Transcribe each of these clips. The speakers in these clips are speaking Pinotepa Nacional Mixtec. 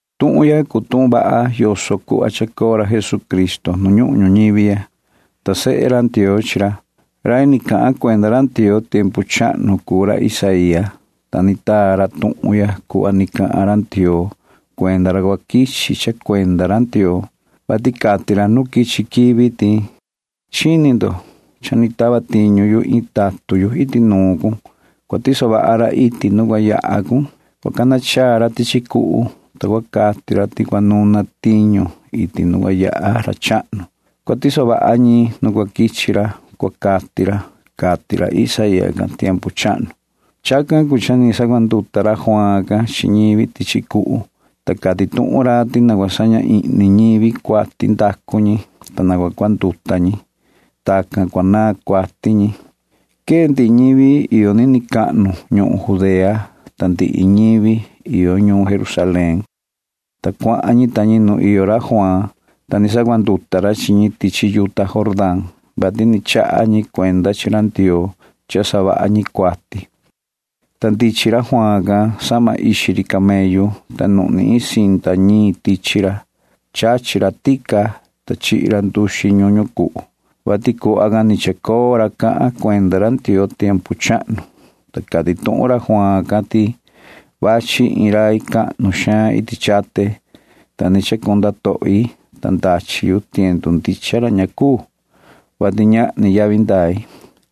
Tuhun ya cuu tuhun vaha yoso cuhva quechaha coo ra Jesucristo nu ñuhun ñuñivi ya, ta sehe Ndioo cuu ra. Rai ni cahan cuenda ra Ndioo tiempu chahnu cuu ra Isaía, ta ni taa ra tuhun ya cuhva ni cati ra Ndioo cuenda ra cua tava tiñu ra, vati cati ra nu quichi quivi ti: Chini cun. Cha ni tava tiñu yu iin tatun yu iti nuun cun. Cua tiso vaha ra tiñu iti nu cua yaha cun. Cua cana chaa maan ra tichi cuhu, ta cua cati ra ti cua tahvi ñivi iti nu cua yaha ra chahnu. Cua tiso vaha ñi tiñu nu cua quichi ra, cua cati ra, cati ra Isaía can tiempu chahnu. Chacan cuu cha ni sacuanduta ra Juaan can chi ñivi tichi cuhu, ta cati tuhun ra ti na cua saña ihni ñivi cuati ndacu ñi, ta na cua cuanduta ñi. Chacan cuu cha cua naan cuati ñi. Quee ndihi ñivi iyo nini cahnu ñuhun Judea, ta quee tahan ndihi ñivi iyo ñuun Jerusalén, ta cuahan ñi ta ñi nu iyo ra Juaan, ta ni sacuanduta ra chi ñi tichi yuta Jordán can, vati ni chaha ñi cuenda chi ra Ndioo ti ña vaha cha ni savaha ñi cuati. Ta ndichin ra Juaan can sahma ixi ri camellu, ta nuhni iin cinta ñiin tichi ra. Chachi ra tica, ta chihi ra nduxi ñuñu cuhu, [vati cuhva can ni chacoo ra cahan cuenda ra Ndioo tiempu chahnu,] ta cati tuhun ra Juaan can ti: ―Vachi iin rai cahnu xaan iti chate, ta ni ña ni cuu chacunda tohi, ta ndachi yu tiendu ndicha ra, [vati ñahni yavi ndai].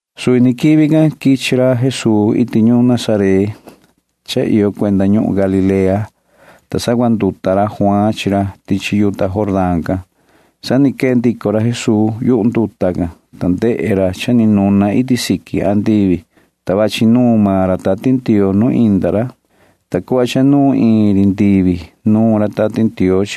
Suvi ni quivi can quichi ra Jesuu iti ñuun Nazaret cha iyo cuenda ñuhun Galilea, ta sacuanduta ra Juaan chi ra tichi yuta Jordán can. Sa ni quee ndico ra Jesuu yu nduta can, ta ndehe ra cha ni nuna iti siqui andivi, ta vachi nuun maan ra Tati Ndioo nu inda ra. Ni vii cuhva cha nuun iin ri ndivi nuun ra Tati Ndioo,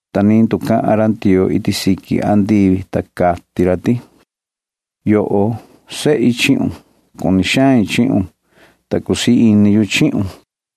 ta ni nducahan ra Ndioo iti siqui andivi, ta cati ra ti: ―Yoho, sehi chihun. Cuni xain chihun, ta cusii ini yu chihun ―cati ndusu can.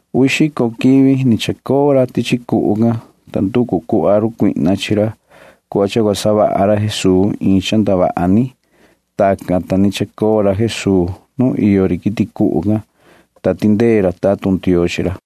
Uvi xico quivi ni chacoo ra tichi cuhu can, ta nducu maan run Satanaa cuhva cha cua savaha ra Jesuu iin cha ndavaha ni. Tacan, ta ni chacoo ra Jesuu nu iyo ri quiti cuhu can, ta tindee ra tatun Ndioo chi ra.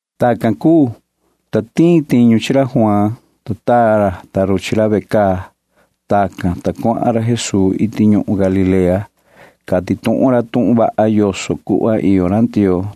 Tacan cuu, ta tiin tiñu chi ra Juaan, ta taa ra chi ra ve caa. Tacan, ta cuahan ra Jesuu iti ñuhun Galilea. Cati tuhun ra tuhun vaha yoso cuhva iyo ra Ndioo,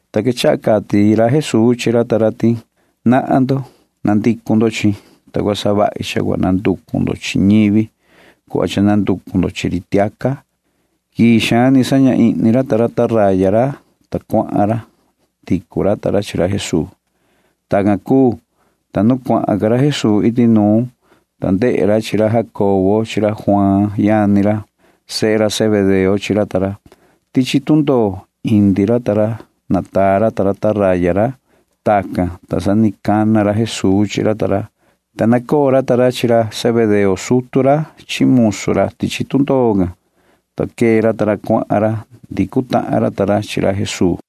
ta quechaha cati Jesuu chi ra ta ra ti: ―Nahan ndo. Na cua coo ndo chihin yu, ta cua savahi cha cua nanducu ndo chi ñivi cuhva cha nanducu ndo chi ri tiaca ―cati ra chi ra ta ra. Quii xaan ni saña ihni ra ta ra taraya ra, ta cuahan ra. Ndicu ra ta ra chi ra Jesuu. Tacan cuu, ta yaha ra Jesuu suhva ca iti nuun, ta ndehe ra chi ra Jacobo chi Juaan yani ra. Sehe Zebedeo chi ra ta ra. Ni vii indi ra ta ra tichi tundoo, ta nataa ra ta ra taraya ra. Tacan, ta sa ni cana ra Jesuu chi ra ta ra, ta nacoo ra ta ra chi ra Zebedeo sutu ra chi musu ra tichi tundoo can, ta quee ra cuahan ra. Ndicu tahan ra ta ra chi ra Jesuu.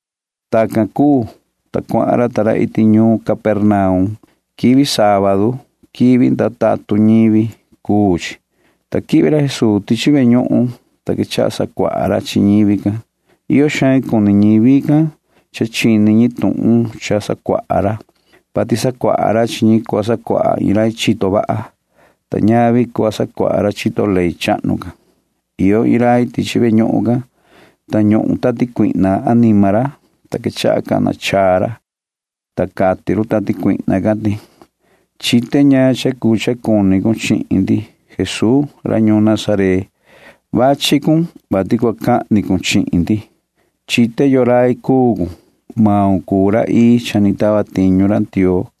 Tacan cuu, ta cuahan ra ta ra iti ñuun Capernaum. Quivi sábadu [quivi ndaa tatun ñivi] cuu chi, ta quihvi ra Jesuu tichi ve ñuhun, ta quechaha sacuaha ra chi ñivi can. Iyo xaan cuni ñivi can chini ñi tuhun cha sacuaha ra, vati sacuaha ra chi ñi cuhva sacuaha iin rai iyo tu ndee ini, ta ñavi cuhva sacuaha ra chito ley chahnu can. Iyo iin rai tichi ve ñuhun can, ta ñuhun tati cuihna anima ra, ta quechaha cana chaa ra, ta cati run tati cuihna can ti: ―Chite ñaan cha cuu cha cuni cun chihin ndi, yoho Jesuu ra ñuun Nazaret. Cha vachi cun, vati cua cahni cun chihin ndi. Chite yoo rai cuun. Maun cuu ra ii cha ni tava tiñu ra Ndioo ―cati run.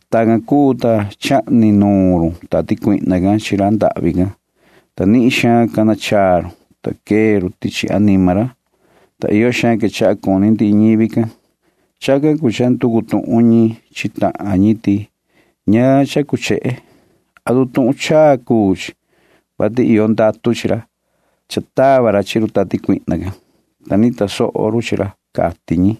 Tacan cuu, ta chahni rai run tati cuihna can chi ra ndahvi can, ta nihin xaan cana chaa run, ta quee run tichi anima ra, ta iyo xaan quechaha cuni ndihi ñivi can. Chacan cuu cha nducu tuhun ñi chi tahan ñi ti: ―¿Ñaan cha cuu chehe? ¿Atu tuhun chaa cuu chi, vati iyo ndatu chi ra? Cha tava ra chi run tati cuihna can, ta ni tasoho run chi ra ―cati ñi.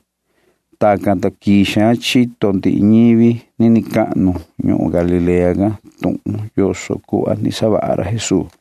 Tacan, ta quii xaan chini soho ndihi ñivi nini cahnu ñuhun Galilea can tuhun yoso cha ni savaha ra Jesuu.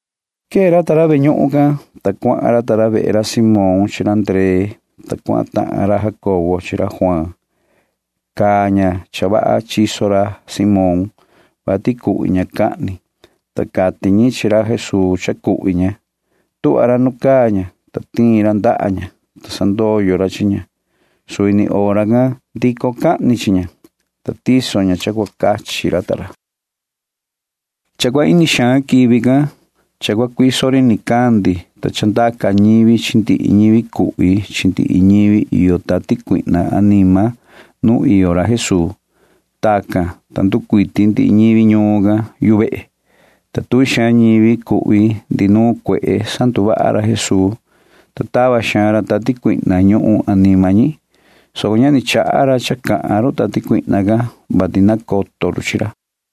Quee ra ta ra ve ñuhun can, ta cuahan ra. Queta ra ta ra vehe ra Simón chi ra Ndree, ta cuahan tahan ra Jacobo chi ra Juaan. Caa ña cha vaha chiso ra Simón, vati cuhvi ña cahni, ta sa ni nducahan ñi chi ra Jesuu ti cha cuhvi ña. Tuhva ra nu caa ña, ta tiin ra ndaha ña, ta sandoyo ra chi ña. Suvi ni hora can ndico cahni chi ña, ta quechaha tiso ña mesa iti nuun ra ta ra. Cha cua ini xaan quivi can, ta cua cuiso ri nicandi, ta chandaca ñivi chi ndihi ñivi cuhvi chi ndihi ñivi iyo tati cuihna anima nu iyo ra Jesuu. Tacan, ta nducuiti ndihi ñivi ñuun can yu vehe, ta iyo cuiti tuvi xaan ñivi cuhvi chi ndihi nuun cuehe can, ta sanduvaha ra Jesuu chi ñi, ta tava xaan ra cuaha tati cuihna ñuhun anima ñi, soco ña ni chaha ra cha cahan run tati cuihna can, vati nacoto run chi ra.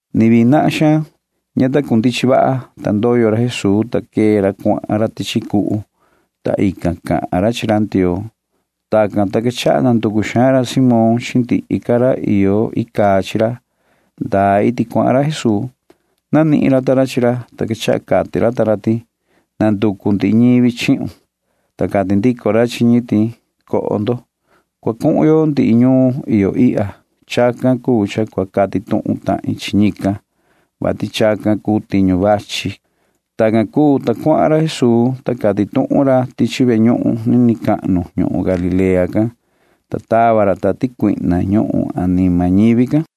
Ni vii nahan xaan, ta ndoyo ra Jesuu. Ña ta cundichin, ta ndoyo ra, ta quee ra cuahan ra tichi cuhu, ta ican cahan ra chi ra Ndioo. Tacan, ta quechaha nanducu xaan ra Simón chi ñi iyo chi ra ndaa iti cuahan ra Jesuu. Nanihin ñi chi ra, ta quechaha cati ñi chi ra ti: ―Nanducu ndihi ñivi chihun ―cati ñi. Ta cati ndico ra chi ñi ti: ―Na coho. Cua cuhun yo ndihi ñuun iyo ihya. Chacan cuu cha cua cati tuhun tahin chi ñican, vati chacan cuu tiñu vachi ―cati ra. Tacan cuu, ta cuahan ra Jesuu, ta cati tuhun ra tichi ve ñuhun ñi nini cahnu ñuhun Galilea can, ta tava ra tati cuihna ñuhun anima ñivi can.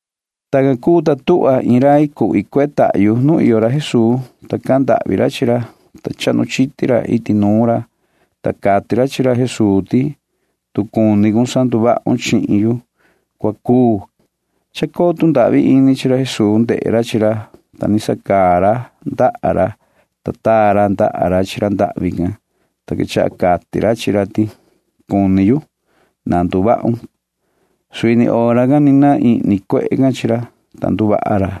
Tacan cuu, ta tuhva iin rai cuhvi cuehe tahyu nu iyo ra Jesuu, ta cahan ndahvi ra chi ra, ta chahnu chiti ra iti nuun ra. Cati ra chi ra Jesuu ti: ―Tu cua cuni cun sanduvahun chihin yu, cua cuu ―cati ra. Uhvi xaan cuni ra Jesuu ndehe ra chi ra, ta ni sacaa ra ndaha ra, ta taa ra ndaha ra chi ra ndahvi can, ta quechaha cati ra chi ra ti: ―Cuni yu. Na nduvahun ―cati ra. Suvi ni hora can ni naan ihni cuehe can chi ra, ta nduvaha ra,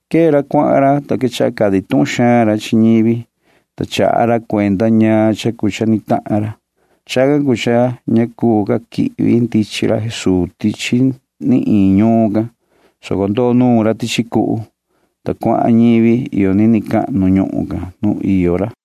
Quee ra cuahan ra, ta quechaha cati tuhun xaan ra chi ñivi, ta chaha ra cuenda ñaan cha cuu cha ni tahan ra. Chacan cuu cha ña cuu ca quihvi ndichin ra Jesuu tichi ni iin ñuun can, soco ndoo nuun maan ra tichi cuhu, ta cuahan ñivi iyo nini cahnu ñuhun can nu iyo ra.